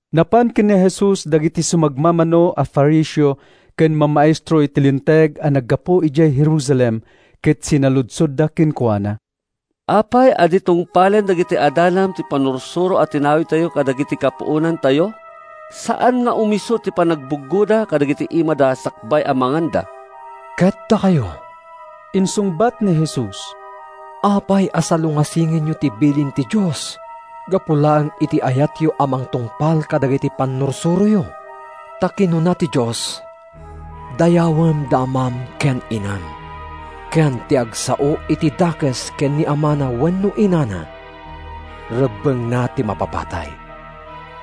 Napan ken ni Jesus dagiti sumagmamano a Fariseo ken mamaestro iti Linteg a naggapu idiay Jerusalem ket sinaludsodda kenkuana, “Apay a di tungpalen dagiti adalam ti pannursuro a tinawidtayo kadagiti kapuonantayo? Saan nga umisu ti panangbuggoda kadagiti imada sakbay a manganda.” “Ket dakayo,” insungbat ni Jesus, “apay a salungasingenyo ti bilin ti Dios gapu laeng iti ayatyo a mangtungpal kadagiti pannursuroyo? Ta kinuna ti Dios, ‘Dayawem da amam ken inam,’ ken ‘Ti agsao iti dakes ken ni amana wenno inana, rebbengna ti mapapatay.’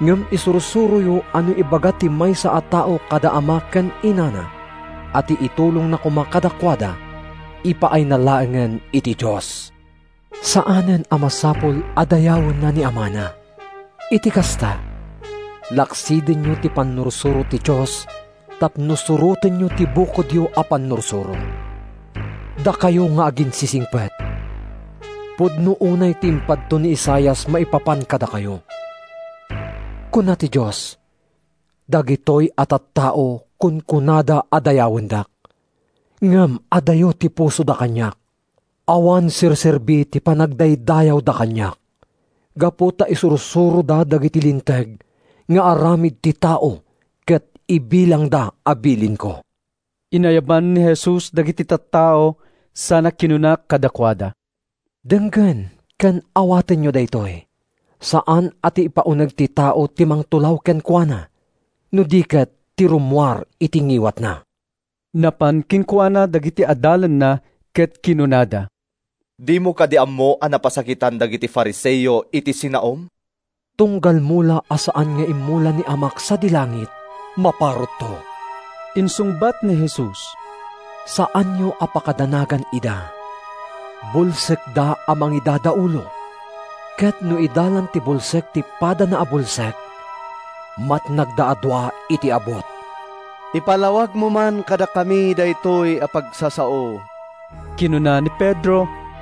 Ngem isursuroyo a no ibaga ti maysa a tao kada ama ken inana a ti itulongna koma kadakuada ipaayna laengen iti Dios, saanen a masapul a dayawenna ni amana. Iti kasta, laksidenyo ti pannursuro ti Dios tapno surotenyo ti bukodyo a pannursuro. Dakayo nga aginsisingpet! Pudno unay ti impadto ni Isaias maipapan kadakayo: ‘Kuna ti Dios, dagitoy a tattao kunkunada a dayawendak, Ngem adayo ti pusoda kaniak. Awan serserbi ti panagdaydayawda kaniak Gapu ta isursuroda dagiti linteg nga aramid ti tao ket ibilangda a bilinko.’” Inayaban ni Jesus dagiti tattao sana kinuna kadakuada, “Denggen ken awatenyo daytoy: Saan a ti ipauneg ti tao ti mangtulaw kenkuana no di ket ti rummuar iti ngiwatna.” Napan kenkuana dagiti adalanna ket kinunada, “Dimo kadi ammo a napasakitan dagiti Fariseo iti sinaom?” “Tunggal mula a saan nga immula ni Amak sadi langit, maparutto,” insungbat ni Jesus. “Saanyo a pakadanagan ida. Bulsekda a mangidadaulo. Ket no idalan ti bulsek ti padana a bulsek, matnagda a dua iti abut.” “Ipalawagmo man kadakami daytoy a pagsasao,” kinuna ni Pedro.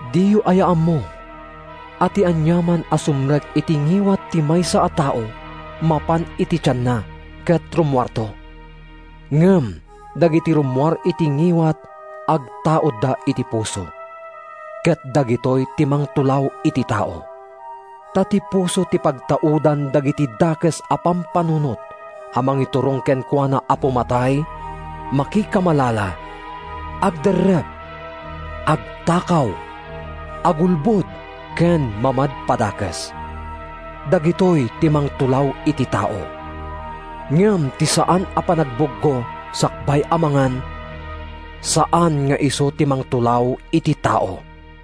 “Diyo aya ammo a ti aniaman a sumrek iti ngiwat ti maysa a tao mapan iti tianna ket rummuarto? Ngem dagiti rummuar iti ngiwat agtaudda iti puso, ket dagitoy ti mangtulaw iti tao. Ta ti puso ti pagtaudan dagiti dakes a pampanunot a mangiturong kenkuana a pumatay, makikamalala, agderrep, agtakaw, agulbod ken mamadpadakes. Dagitoy ti mangtulaw iti tao. Ngem ti saan a panagbuggo sakbay a mangan, saan nga isu ti mangtulaw iti tao.”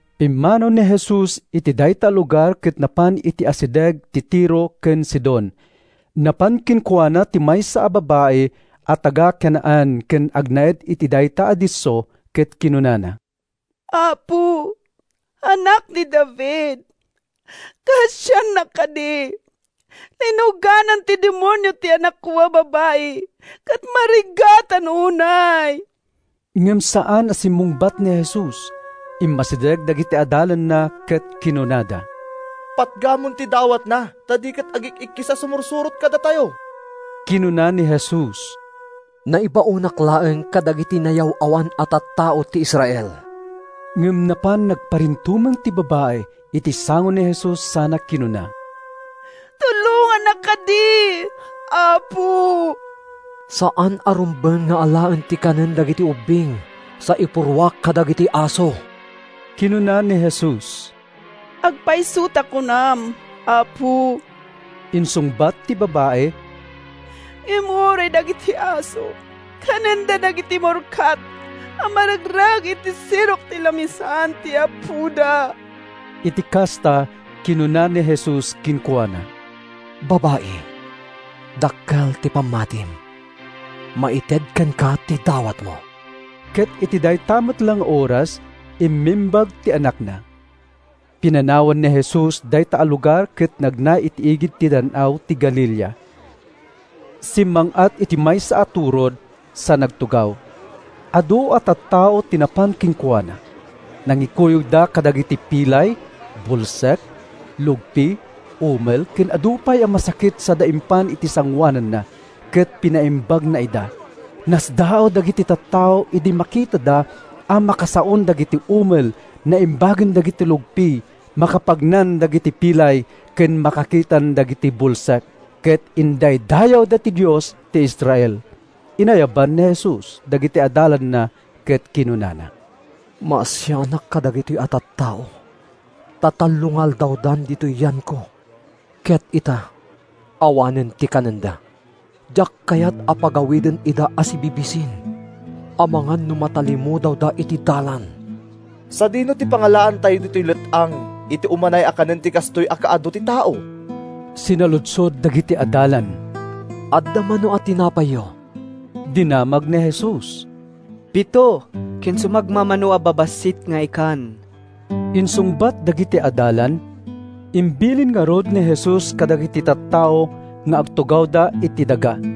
Pimmanaw ni Jesus iti dayta a lugar ket napan iti asideg ti Tiro ken Sidon. Napan kenkuana ti maysa a babai a taga-Canaan ken agnaed iti dayta a disso ket kinunana, “Apo, Anak ni David, kaasiannak kadi! Linuganan ti demonio ti anakko a babai ket marigatan unay.” Ngem saan a sinungbatan ni Jesus. Immasideg dagiti adalanna ket kinunada, “Patgamon ti dawatna ta di ket agik-ikkis a sumursurot kadatayo.” Kinuna ni Jesus, “Naibaonak laeng kadagiti nayaw-awan a tattao ti Israel.” Ngem napan nagparintumeng ti babai iti sango ni Jesus sana kinuna, “Tulongannak kadi, Apo!” “Saan a rumbeng nga alaen ti kanen dagiti ubbing sa ipurruak kadagiti aso,” kinuna ni Jesus. “Agpayso ta kunam, Apo,” insungbat ti babai, “ngem uray dagiti aso kanenda dagiti murkat a maregreg iti sirok ti lamisaan ti apoda.” Iti kasta, kinuna ni Jesus kenkuana, “Babai, dakkel ti pammatim! Maited kenka ti dawatmo.” Ket iti dayta met la nga oras, immimbag ti anakna. Pinanawan ni Jesus dayta a lugar ket nagna iti igid ti Dan-aw ti Galilea. Simmang-at iti maysa a turod sa nagtugaw. Adu a tattao ti napan kenkuana. Nangikuyogda kadagiti pilay, bulsek, lugpi, umel ken adu pay a masakit sada impan iti sangoananna, ket pinaimbagna ida. Nasdaaw dagiti tattao idi makitada a makasaon dagiti umel, naimbagen dagiti lugpi, makapagnan dagiti pilay ken makakitan dagiti bulsek, ket indaydayawda ti Dios ti Israel. Inayaban ni Jesus dagiti adalanna ket kinunana, “Maasianak kadagitoy a tattao ta tallo nga aldawdan ditoy yanko ket ita, awanen ti kanenda. Diak kayat a pagawiden ida a sibibisin amangan no matalimudawda iti dalan.” “Sadino ti pangalaantayo ditoy let-ang iti umanay a kanen ti kastoy a kaadu ti tao?” sinaludsod dagiti adalan. “Adda mano a tinapayyo?” dinamag ni Jesus. “Pito, ken sumagmamano a babassit nga ikan,” insungbat dagiti adalan. Imbilin ngarud ni Jesus kadagiti tattao nga agtugawda iti daga.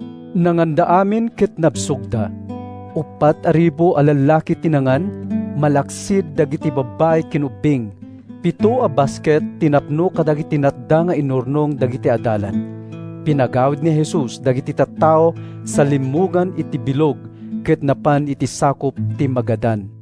Nanganda amin ket nabsogda. Uppat a ribu a lallaki ti nangan, malaksid dagiti babbai ken ubbing. Pito a basket ti napno kadagiti natda nga inurnong dagiti adalan. Pinagawid ni Jesus dagiti tattao sa limmugan iti bilog ket napan iti sakup ti Magadan.